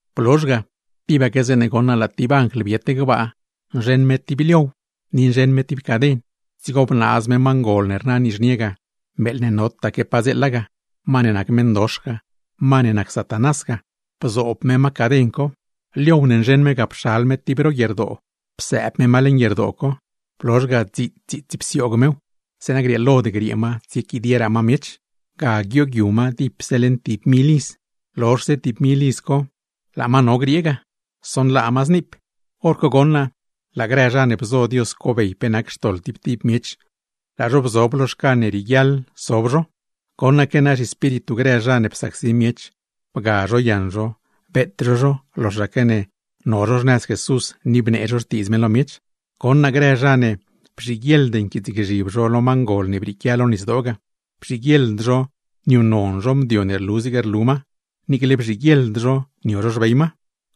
Blozh ga, tibaque zeeṉe goṉ naa laa tib anjl biet gbaa, nzheṉ me tib liow, ni nzheṉ me tib caden. Dzigo bnaaz me ma ngol ne rna nizhnie ga, meeḻ ne notaque padzeela ga, ma ne nac meṉdox ga, ma ne nac Satanás ga, bzoob me ma caden co; con liow ne nzheṉ me ga pxal me tib ro guierdoo, psëëb me ma leṉ guierdoo co. Blozh ga dziits dziits psioog mew, zeeṉa grieelod griee ma tsiequidieraa ma miech. Ga tsogyu ma dipse leṉ tib mil iz, lozhse tib mil iz co ible laa ma no griee ga, sonlaa ma zniip. Horco goṉ naa laa grë zha ne bzo Dios cobey pe nac xtoḻ tib tib miech, laa zho bzob lo xcan ne rieguiaḻ sob zho. Goṉaque naa xalm grë zha ne psacsi miech, bga zho yaṉ zho, beet zho zho loxaque ne no zho xnëz Jesús ni bnee zho xtiidz me lo miech; goṉ naa grë zha ne bzhiguieḻd nquiitsgzhib lo ma ngol ne brieequia lo nisdoo ga, bzhiguieḻd zho niuṉnon zho mdio ne rlu zig rlu ma, niicle bzhiguieḻd zho nio zho xbey ma.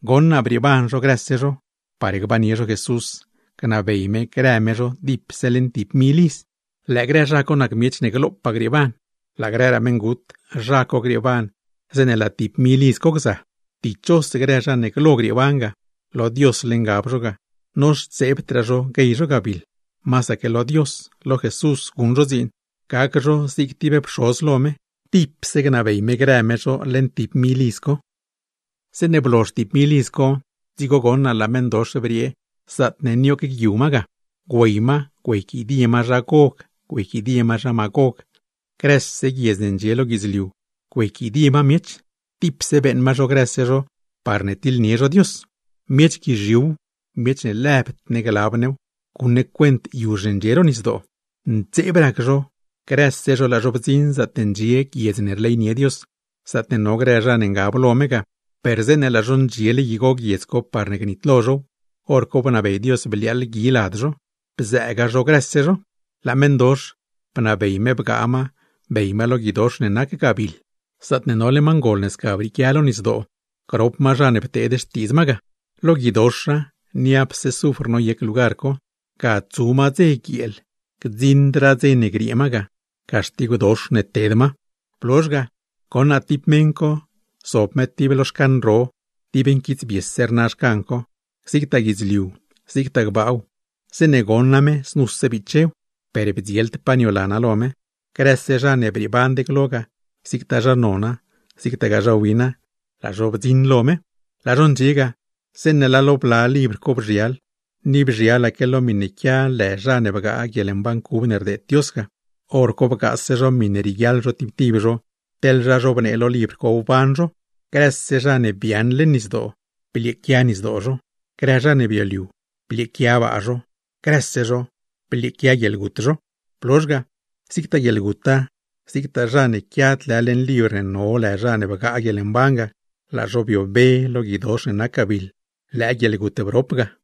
Goṉ naa brieeban zho grëse zho, par gbannie zho Jesús, gnabey me grë me zho dipse leṉ tib mil iz. Lëë grë zha co nac miech ne glopaa grieeban, laa grëraa meṉgut, zha co grieeban zeeṉe laa tib mil iz co gza. Dichos grë zha ne glo grieeban ga; lo Diosle ngab zho ga, noxtseebdraa zho guey zho gabiḻ, masaque lo Dios, lo Jesús guṉ zho dziin, gac zho zig tib pxoz lo me; tipse gnabey me grë me zho leṉ tib mil iz co. Zeeṉe blozh tib mil iz co, dzigo goṉ naa laa meṉdox briee zaatne nioogyu ma ga, güey ma güeyquidie ma zha Gog, güeyquidie ma zha Magog, grëse guiedz ne ndxie lo guidzliu güeyquidie ma miech, tipse beeṉ ma zho grëse zho parne tiḻnie zho Dios. Miech guizhiuw, miech ne lëb ne glab new, guṉ ne cuent yuzh ne ndxie ro nisdoo, ntseeb rac zho, grëse zho laa zho bdziṉ zaatne ndxie guiedz ne rleynie Dios, zaatne no grë zha ne ngab lo me ga; per zeeṉe laa zho ndxiele igo guiedz co parne gnitlo zhow, hor co bnabey Dios bliaaḻ gui lad zho, bzëëga zho grëse zho. Laa meṉdox, bnabey me bgaa ma bey ma lo guidox ne nac gabiḻ, zaatne nole ma ngol ne sca brieequia lo nisdoo, grop ma co zha ne pteed xtiidz ma ga. Lo guidoxa, niapse zufr noyec lugar co, ga tsu ma dze guieel, gdziṉdraa dze ne griee ma ga; caxtigwdox ne ted ma. Blozh ga, goṉ naa tib meṉ co zob me tib lo xcan ro, dib nquitsbiese rna xcan co. Zigtaa guidzliu, zigtaa gbaaw, zeeṉe goṉa me znuse bichew, per bdzield pa niolana lo me. Grëse zha ne brieeband glo ga, zigtaa zha nona, zigtaa zha wina, laa zho bdziṉ lo me. Laa zho ndxie ga, zeeṉe laa lo bla libr co bzhial, ni bzhialaque lo miṉe quia lë zha ne bgaa guieḻmban cub ne rdeed Dios ga; hor co bgaase zho miṉe rieguiaḻ zho tib tib zho teḻ zha zhobnee lo libr co wban zho. Grëse zha ne biaaṉ leṉ nisdoo, blieequia nisdoo zho, grë zha ne bioliu blieequia baa zho; grëse zho blieequia guieḻgut zho. Blozh ga, zigtaa guieḻguta, zigtaa zha ne quiad lë leṉ libr ne no lë zha ne bgaa guieḻmban ga, laa zho biobe lo guidox ne nac gabiḻ; lëë guieḻgut brop ga.